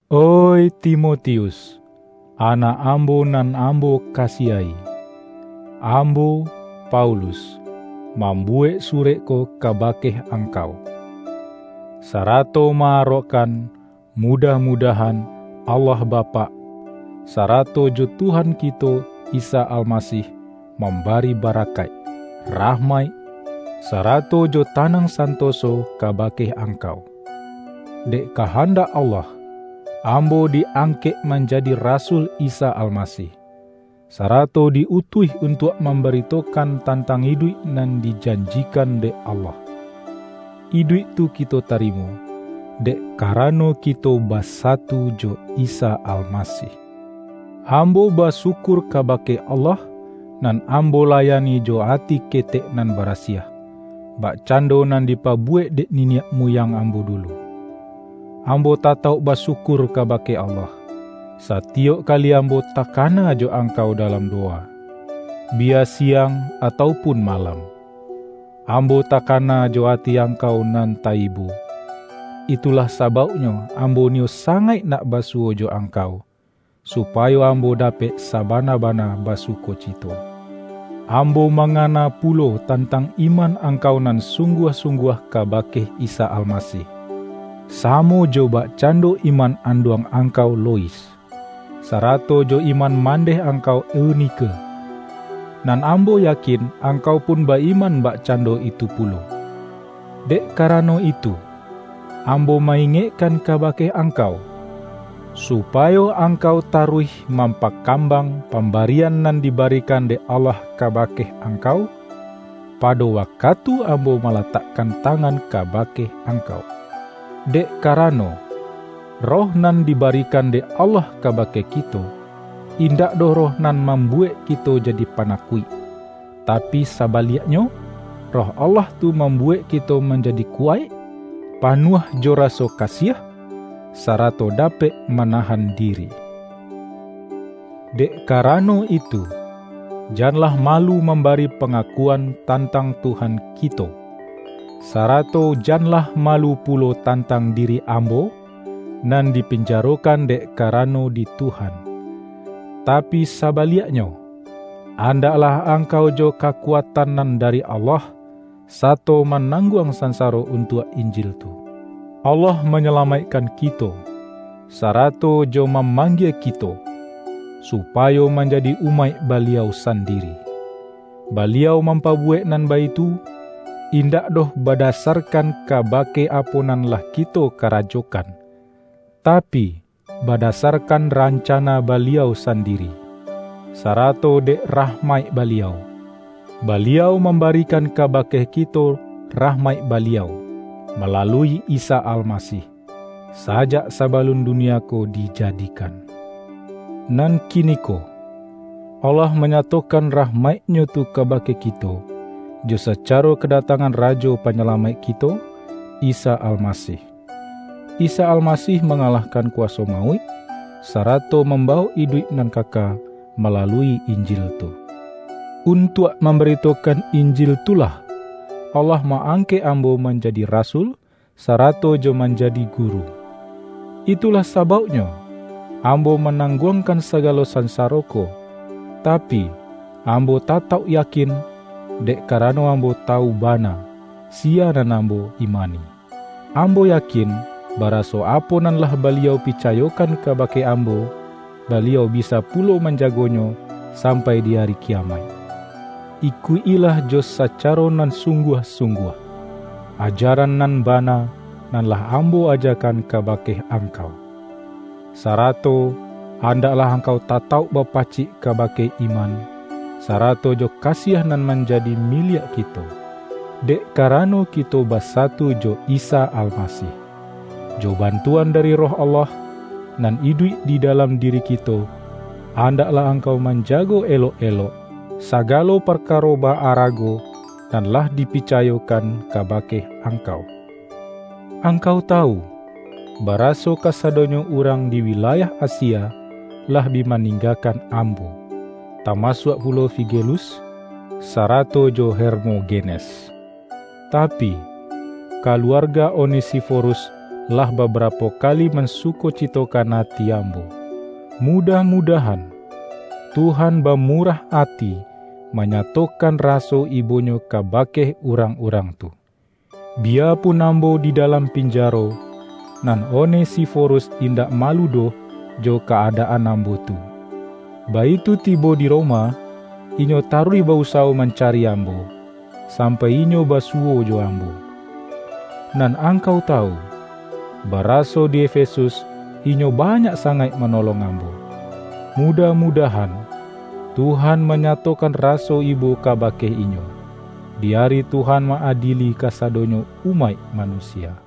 Oih Timotius, anak ambo nan ambo kasiahi! Ambo, Paulus, mam-buwek surek ko kabake angkau, sarato ma-arokkan mudah-mudahan Allah Ba-pak, sarato jo Tuhan kito Isa Almasih, mambari barakaik, rahmaik sarato jo tanang santoso kabake angkau. Dek kahandak Allah, ambo di-ang-kek manjadi rasul Isa Almasih, sara-to di-utuih untuak mambaritokan tan-tang iduik nan dijanjikan dek Allah. Iduik tu kito tarimo, dek karano kito basatu jo Isa Almasih. Ambo basyukur kabake Allah nan ambo layani jo ati ketek nan barasiah, bakcando nan dipabuwek dek niniak muyang ambo dulu. Ambo tatauk ba-syukur kabake Allah, satiyok kali am-bo takana jo angkau dalam dowa, biya siang atau pun malam. Ambo takana jo ati angkau nan ta-ibo. Itulah sabauk-nyo ambo niyo sangaik nak basuwo jo angkau, supayo ambo dapek sabana-bana basukocito. Ambo mangana pu-lo tantang iman angkau nan sungguah-sungguah kabake Isa Almasih, samo jo bakcando iman anduang angkau Lois, sarato jo iman mandeh angkau Eunike. Nan ambo yakin angkau pun ba-iman bakcando itu pulo. Dek karano itu, ambo ma-ingekkan kabake angkau, supayo angkau taruih mampakambang pambarian nan dibarikan dek Allah ka-bake angkau, pado wakatu ambo ma-latakkan tangan kabake angkau. Dek karano, Roh nan dibarikan dek Allah kabake kito, indak doh Roh nan mambuwek kito jadi panakuik. Tapi saba-liaknyo, Roh Allah tu mambuwek kito manjadi kuwaik, panuah jo raso ka-siah, sarato dapek manahan diri. Dek karano itu, janlah malu mam-bari pangakuan tantang Tuhan kito, sarato janlah malu pulo tantang di-ri ambo, nan dipinjarokan dek kara-no di Tuhan. Tapi sabaliaknyo, an-daklah angkau jo kakuatan nan dari Allah, sato manangguang sansaro un-tuak Injil tu. Allah manyalamaikkan kito, sarato jo mamanggie kito, supa-yo manjadi umaik Baliau sandiri. Ba-liau mampabuwek nan baitu, indak doh badasarkan kabake apo nan lah kito karajokan, tapi, badasarkan ran-cana Baliau sandiri, sarato dek rah-maik Baliau. Baliau mambarikan ka-bake kito rahmaik Baliau, malalui Isa Almasih, sajak sabalun dunia ko dija-dikan. Nan kiniko, Allah manyato-kan rahmaik-Nyo tu kabake kito, jo sacaro kadatangan Rajo Panyalamaik kito, Isa Almasih. Isa Almasih manga-lahkan kuwaso mauik, sarato mamba-wok iduik nan kaka malalui Injil tu. Untuak mambaritokan Injil tu lah, Allah ma-angkek ambo manjadi rasul sarato jo manjadi guru. Itu-lah sabauknyo, ambo manangguang-kan sagalo sansaro ko, tapi, ambo ta-tauk yakin, dek karano ambo tawu bana, siya nan ambo imani. Ambo ya-kin, baraso apo nan lah Baliau pica-yokan kabake ambo, Baliau bisa pulo manjagonyo sampai di Ari Kiyamaik. Ikuik-ilah jo sacaro nan sungguah-sungguah, ajaran nan bana nan lah ambo ajakan kabake angkau. Sarato andaklah angkau tatauk bapacik ka-bake iman, sarato jo kasiah nan man-jadi miliak kito, dek karano kito basa-tu jo Isa Almasih. Jo bantuan dari Roh Allah, nan iduik di dalam diri ki-to, andaklah angkau manjago elok-elok, sagalo parkaro ba-arago nan lah dipicayokan kabake angkau. Angkau tawu, baraso kasadonyo urang di wilayah Asia, lah bi maning-gakan ambo, tamasuak pulo Figelus, sarato jo Hermogenes. Tapi, kaluar-ga Onesiforus, lah babarapo kali man-sukocitokan ati ambo. Mudah-mudah-an, Tuhan bamurah ati manyatokan raso ibo-Nyo kabake urang-urang tu. Biyapun ambo di dalam pinjaro, nan Onesiforus indak malu doh jo ka-ada-an ambo tu. Baitu tibo di Roma, inyo taruih ba-usawo mancari ambo, sampai inyo basuwo jo ambo. Nan angkau tawu, baraso di Efesus inyo banyak sangaik manolong ambo. Mu-dah-mudahan, Tuhan manyatokan ra-so ibo kabake inyo, di ari Tuhan ma-adieli kasadonyo umaik manusia.